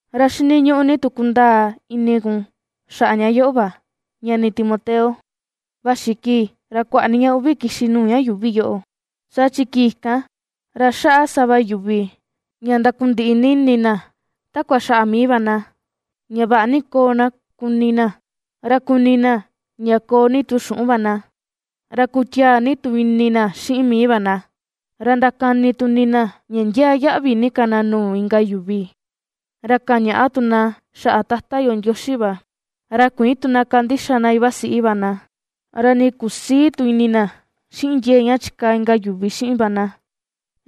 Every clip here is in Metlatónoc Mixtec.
Ra xiniñuꞌu ni tu kundaa ini kun xaꞌa ña yoꞌo va, ñani Timoteo: vaxi kii, ra kuaꞌa ni ña uꞌvi kixi nuu ña yuuvi yoꞌo. Saa chi kii kan, ra xaꞌa sava yuvi ña ndakundiꞌi ni ini na takua xaꞌa mii va na, ña vaꞌa ni koo na kuni na, ra kuni na ña koo ni tu xuꞌun va na, ra kutiaa ni tu ini na xiꞌin mii va na, ra ndakani tu ini na ña ndiaa yaꞌvi ni ka na nuu inka yuvi, ra kañaꞌa tu na xaꞌa Tata yo Ndioxi va, ra kuïin tu na kandixa na na iva siꞌi va na, ra nii kusïi tu ini na xiꞌin ndiee ña chikaa inka yuvi xiꞌin na,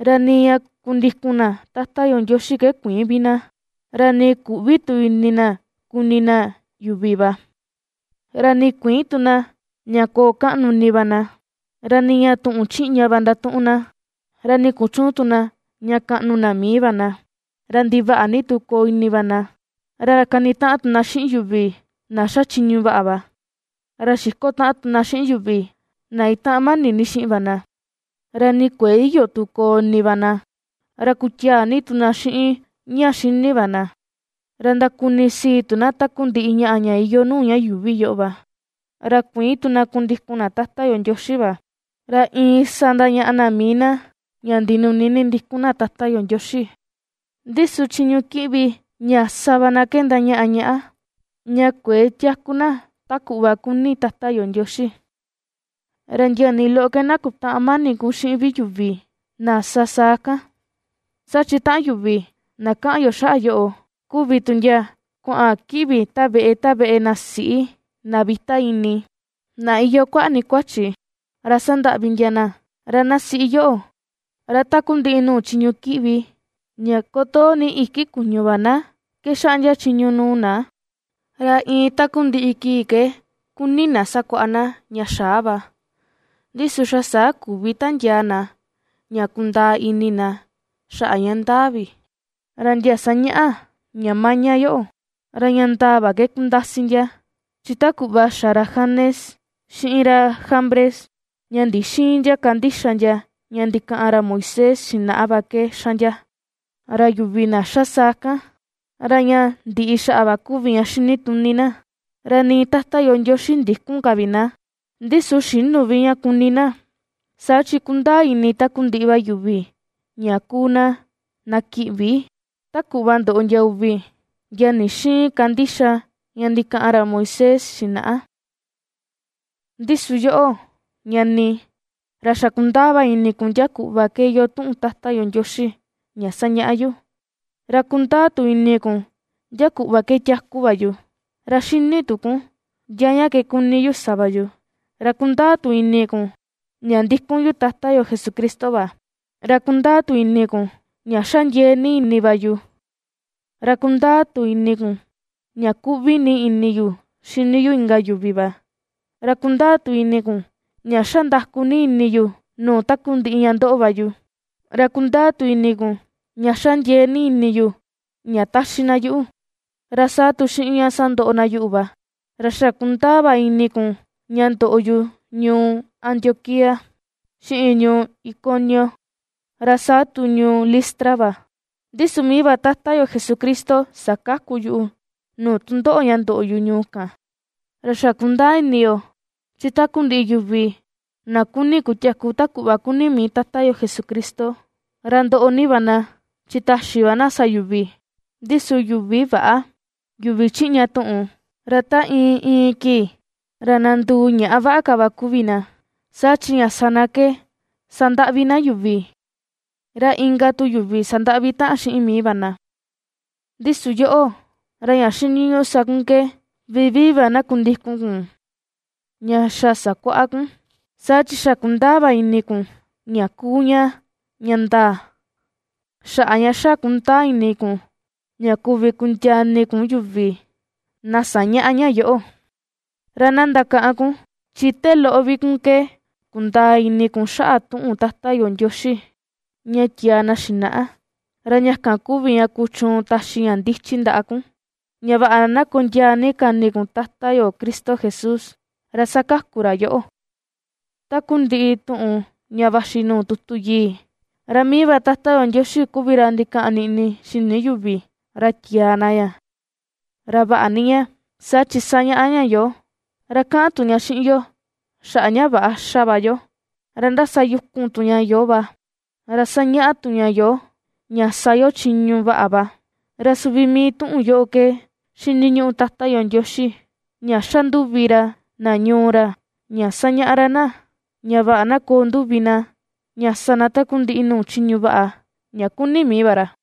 ra nii ña kundikun na Tata yo Ndioxi ke kuïin vi na, ra nii küꞌvi tu ini na kuni na yuvi va, ra nii kuïin tu na ña koo kaꞌnu ini va na; ra niña tuꞌun chiꞌña va ndatuꞌun na, ra nii kuchüun tu na ña kaꞌnu na mii va na, ra ndivaꞌa ni tu koo ini va na, ra kanitaꞌan tu na xiꞌin yuvi na ^xa chiñu vaꞌa va. Ra xiko taꞌan tu na xiꞌin yuvi na itaꞌan mani ni xiꞌin va na, ra nii kuëe iyo tu koo ini va na, ra kutiaa ni tu na xiꞌin ña xini va na, ra ndakunisii tu na takundiꞌi ñaꞌa ña iyoo nuu ña yuuvi yoꞌo va, ra kuïin tu na kundikun na Tata yo Ndioxi va. Ra iin sa ndañaꞌa na mii na ña ndinuni ni ndikun na Tata yo Ndioxi, ndi su chiñu kiꞌvi ña sa va na ke ndañaꞌa ñaꞌa ña kuëe tiaku na ta kuꞌva kuni Tata yo Ndioxi. Ra ndia nii loꞌo ke na kutäꞌan mani kun xiꞌin vi yuvi na sa saa kan, saa chi taꞌan yuvi na kaꞌan yo xaꞌa yoꞌo kuvi tu ndia kuaꞌan kiꞌvi ta veꞌe ta veꞌe na siꞌi, na vita ini, na iyoo kuaꞌa ni kuachi, ra sandaꞌvi ndia na. Ra na siꞌi yoꞌo, ra takundiꞌi nuu chiñu kiꞌvi ña kotoo iki kuñu va na ke xaꞌndia chiñu nuu na. Ra iin takundiꞌi kii ke kuni na sakuaꞌa na ña xaa va, ndi su xa saa küvi tandiaa na ña kundaa ini na xaꞌa ña ndaa vi. Ra ndia ^sañaꞌa ña maña yoꞌo, ra ña ndaa va ke kundasi ndia, chi ta kuꞌva xa ra Janes, xiꞌin ra Jambres, ña ndixïin ndia kandixa ndia ña ndikaꞌan ra Moisés xinaꞌa va ke ^xa ndia. Ra yuvi na xa saa kan, ra ña ndiꞌi xaꞌa va kuvi ña xinituni na, ra nii Tata yo Ndioxi ndïkun ka vi na. Ndi su xïnu vi ña kuni na, saa chi kundaa ini takundiꞌi va yuvi ña kuu na, na kiꞌvi, ta kuꞌva ndoꞌo ndia uvi, ndia ndixïin kandixa ña ndikaꞌan ra Moisés xinaꞌa. Ndi su yoꞌo, ñani, ra xa kundaa va ini kun ndia kuꞌva ke iyoo tuꞌun Tata yo Ndioxi ña sañaꞌa yu, ra kundaa tu ini kun ndia kuꞌva ke tiaku va yu, ra xini tu kun ndia ña ke kuni yu sa va yu. Ra kundaa tu ini kun ña ndikun yu Tata yo Jesucristo va, ra kundaa tu ini kun ña xa ^ndiee ni ini va yu, ra kundaa tu ini kun ña kuꞌvi ni ini yu xini yu inka yuvi va, ra kundaa tu ini kun ña ^xa nda̱ku̱ ni ini yu nuu takundiꞌi ña ^ndoꞌo va yu, ra kundaa tu ini kun ña ^xa ndiee ni ini yu ña taxi na yuꞌu, ra saa tu xiꞌin ña sandoꞌo na yuꞌu va, ra xa kundaa va ini kun ña ndoꞌo yu ñuu Antioquía, xiꞌin ñuu Iconio, ra saa tu ñuu Listra va; ndi su mii va Tata yo Jesucristo sakaku yuꞌu nuu tundoꞌo ña ndoꞌo yu ñuu kan. Ra xa kundaa ini yo, chi takundiꞌi yuvi na kuni kutiaku ta kuꞌva kuni mii Tata yo Jesucristo, ra ndoꞌo ni va na, chi taxi va na sa yuvi; ndi su yuvi väꞌa, yuvi chiꞌña tuꞌun, ra ta iin iin kii ra na nduu ñaꞌa vaꞌa ka va kuvi na, saa chi ña sa na ke sandaꞌvi na yuvi, ra inka tu yuvi sandaꞌvi taꞌan xiꞌin mii va na. Ndi su yoꞌo, ra ña xiniñuꞌu sa kun ke vivii va na kundikun kun ña xa sakuaꞌa kun, saa chi xa ^kundaa va ini kun ña kuu ña ña ndaa, xaꞌa ña xa ^kundaa ini kun ña kuvi kundiaa ini kun yuvi na sañaꞌa ña yoꞌo. Ra na ndakaꞌan kun, chi te loꞌo vi kun ke kundaa ini kun xaꞌa tuꞌun Tata yo Ndioxi ña tiaa na xinaꞌa, ra ña kan kuvi ña kuchuun taxi ña ndichi ndaꞌa kun, ña vaꞌa na kondiaa ni ka ini kun Tata yo Cristo Jesús, ra sakaku ra yoꞌo. Takundiꞌi tuꞌun ña vaxi nuu tutu yii, ra mii va Tata yo Ndioxi kuvi ra ndikaꞌan niꞌni xini yuvi, ra tiaa na ña. Ra vaꞌa ni ña, saa chi sañaꞌa ña yoo, ra kaꞌan tu ña xiꞌin yo xaꞌa ña väꞌa ^xa va yo, ra ^ndasayukun tu ña yoo va, ra sañaꞌa tu ña yoo ña sa yo chiñu vaꞌa va, ra suvi mii tuꞌun yoꞌo ke ^xiniñuꞌu Tata yo Ndioxi, ña xa nduvi ra na ñuu ra, ña ^sañaꞌa ra na, ña vaꞌa na koo nduvi na ña sa na takundiꞌi nuu chiñu vaꞌa, ña kuni mii va ra.